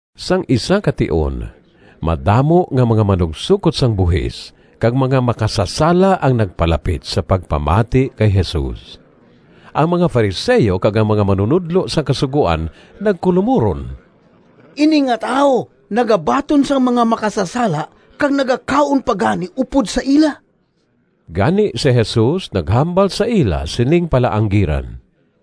Sang isa ka tion madamo nga mga manugsokot sang buhis kag mga makasasala ang nagpalapit sa pagpamati kay Jesus. Ang mga Fariseo kag ang mga manunodlo sang Kasugoan nagkulomuron, “Ini nga tawo nagabaton sang mga makasasala kag nagakaon pa gani upod sa ila.” Gani si Jesus naghambal sa ila sining palaanggiran: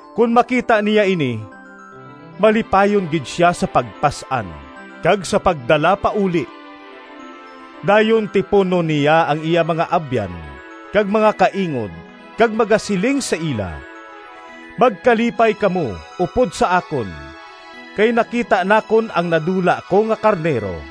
Kon makita niya ini malipayon gid sia sa pagpas-an kag sa pagdala pauli. Dayon tipunon niya ang iya mga abyan kag mga kaingod kag magasiling sa ila, ‘Magkalipay kamo upod sa akon kay nakita nakon ang nadula ko nga karnero!’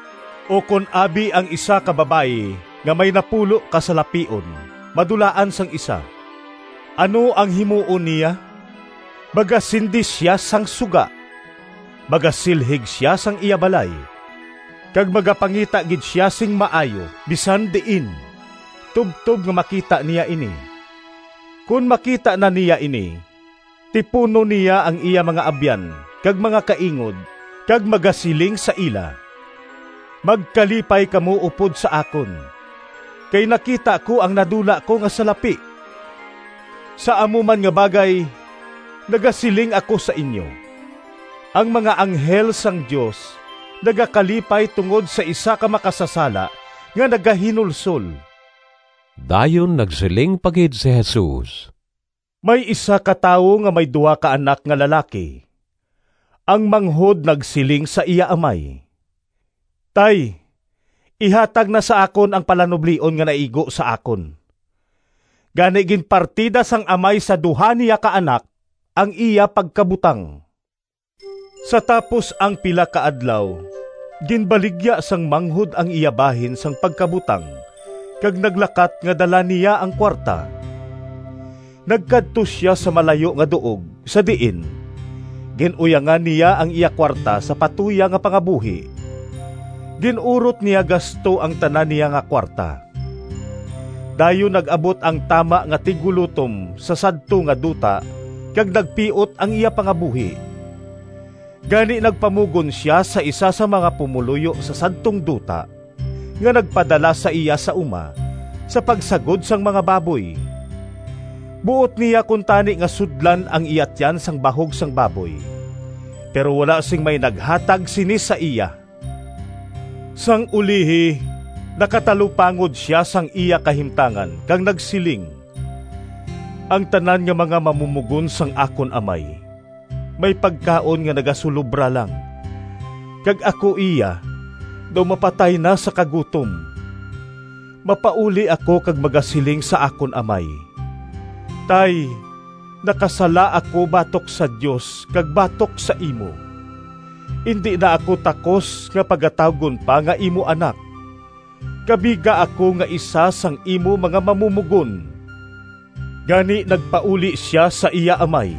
“Ukon abi ang isa ka babayi nga may napulo ka salapion madulaan sang isa. Ano ang himuon niya? Magasindi sia sang suga, magasilhig sia sang iya balay, kag magapangita gid sia sing maayo bisan diin tubtob nga makita niya ini. Kon makita na niya ini, tipunon niya ang iya mga abyan kag mga kaingod kag magasiling sa ila, ‘Magkalipay kamo upod sa akon, kay nakita ko ang nadula ko nga salapi!’ Sa amo man nga bagay, nagasiling ako sa inyo, ang mga anghel sang Dios nagakalipay tungod sa isa ka makasasala nga nagahinulsol.” Dayon nagsiling pa gid si Jesus, “May isa ka tawo nga may duha ka anak nga lalaki. Ang manghod nagsiling sa iya amay, ‘Tay, ihatag na sa akon ang palanublion nga naigo sa akon.’ Gani ginpartida sang amay sa duha niya ka anak ang iya pagkabutang. Sa tapos ang pila ka adlaw ginbaligya sang manghod ang iya bahin sang pagkabutang kag naglakat nga dala niya ang kuwarta. Nagkadto sia sa malayo nga duog, sa diin gin-uyangan niya ang iya kuwarta sa patuyang nga pangabuhi. Gin-urot niya gasto ang tanan niya nga kuwarta. Dayon nag-abot ang tama nga tiggulotom sa sadto nga duta kag nagpiot ang iya pangabuhi. Gani nagpamugon sia sa isa sang mga pumoluyo sa sadtong duta, nga nagpadala sa iya sa uma sa pagsagod sang mga baboy. Buot niya kuntani nga sudlan ang iya tiyan sang bahog sang baboy, pero wala sing may naghatag sini sa iya. Sang ulihi nakatalupangod sia sang iya kahimtangan kag nagsiling, ‘Ang tanan nga mga mamumogon sang akon amay may pagkaon nga nagasulobra lang, kag ako iya daw mapatay na sa kagutom. Mapauli ako kag magasiling sa akon amay, “Tay, nakasala ako batok sa Dios kag batok sa imo. Indi na ako takos nga pagatawgon pa nga imo anak. Kabiga ako nga isa sang imo mga mamumogon.” ’ Gani nagpauli sia sa iya amay.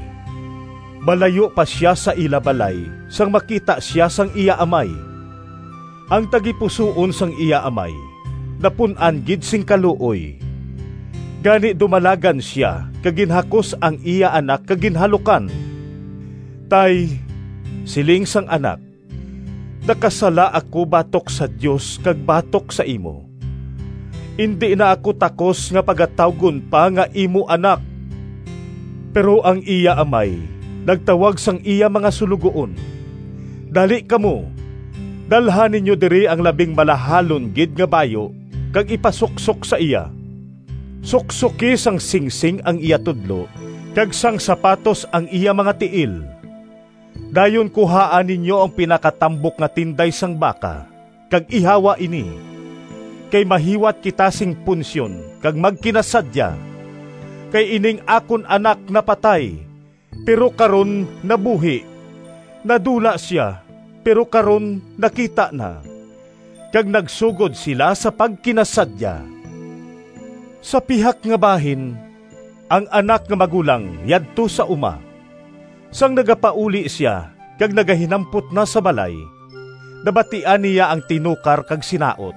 “Malayo pa sia sa ila balay sang makita sia sang iya amay. Ang tagipusoon sang iya amay napun-an gid sing kaluoy, gani dumalagan sia kag ginhakos ang iya anak kag ginhalukan. ‘Tay,’ siling sang anak, ‘Nakasala ako batok sa Dios kag batok sa imo. Indi na ako takos nga pagatawgon pa nga imo anak.’ Pero ang iya amay nagtawag sang iya mga suloguon, ‘Dali kamo, dalha ninyo diri ang labing malahalon gid nga bayu kag ipasuksok sa iya. Suksoki sang singsing ang iya tudlo kag sang sapatos ang iya mga tiil. Dayon kuhaa ninyo ang pinatambok nga tinday sang baka kag ihawa ini, kay mahiwat kita sing punsyon kag magkinasadya! Kay ining akon anak napatay, pero karon nabuhi; nadula sia, pero karon nakita na.’ Kag nagsugod sila sa pagkinasadya. “Sa pihak nga bahin, ang anak nga magulang yadto sa uma. Sang nagapauli sia kag nagahinampot na sa balay, nabatian niya ang tinukar kag sinaot.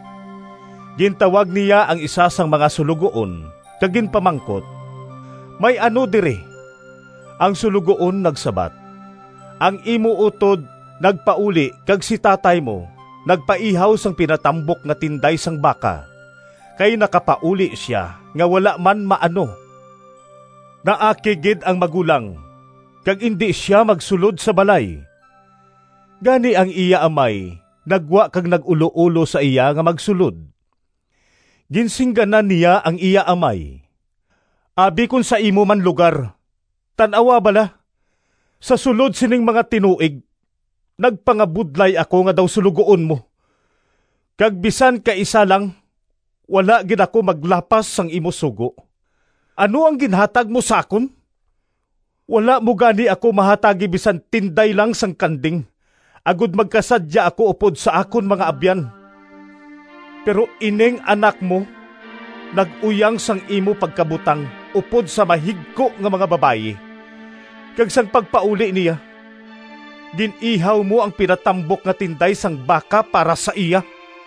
Gintawag niya ang isa sang mga suloguon kag ginpamangkot, ‘May ano diri?’ Ang suloguon nagsabat, ‘Ang imo utod nagpauli kag si tatay mo nagpaihaw sang pinatambok nga tinday sang baka, kay nakapauli sia nga wala man maano.’ Naakig gid ang magulang kag indi sia magsulod sa balay. Gani ang iya amay naggwa kag nag-uloulo sa iya nga magsulod. Ginsingganan niya ang iya amay, ‘Abi kon sa imo man lugar, tan-awa bala, sa sulod sining mga tinuig nagpangabudlay ako nga daw suloguon mo kag bisan kaisa lang wala gid ako maglapas sang imo sugo. Ano ang ginhatag mo sa akon? Wala mo gani ako mahatagi bisan tinday lang sang kanding agod magkasadya ako upod sa akon mga abyan! Pero ining anak mo nag-uyang sang imo pagkabutang upod sa mahigko nga mga babayi, kag sang pagpauli niya gin-ihaw mo ang pinatambok nga tinday sang baka para sa iya.’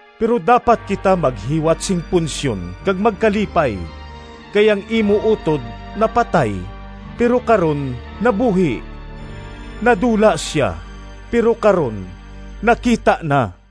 Pero dapat kita maghiwat sing punsyon kag magkalipay, kay ang imo utod napatay, pero karon nabuhi; nadula sia, pero karon nakita na.’”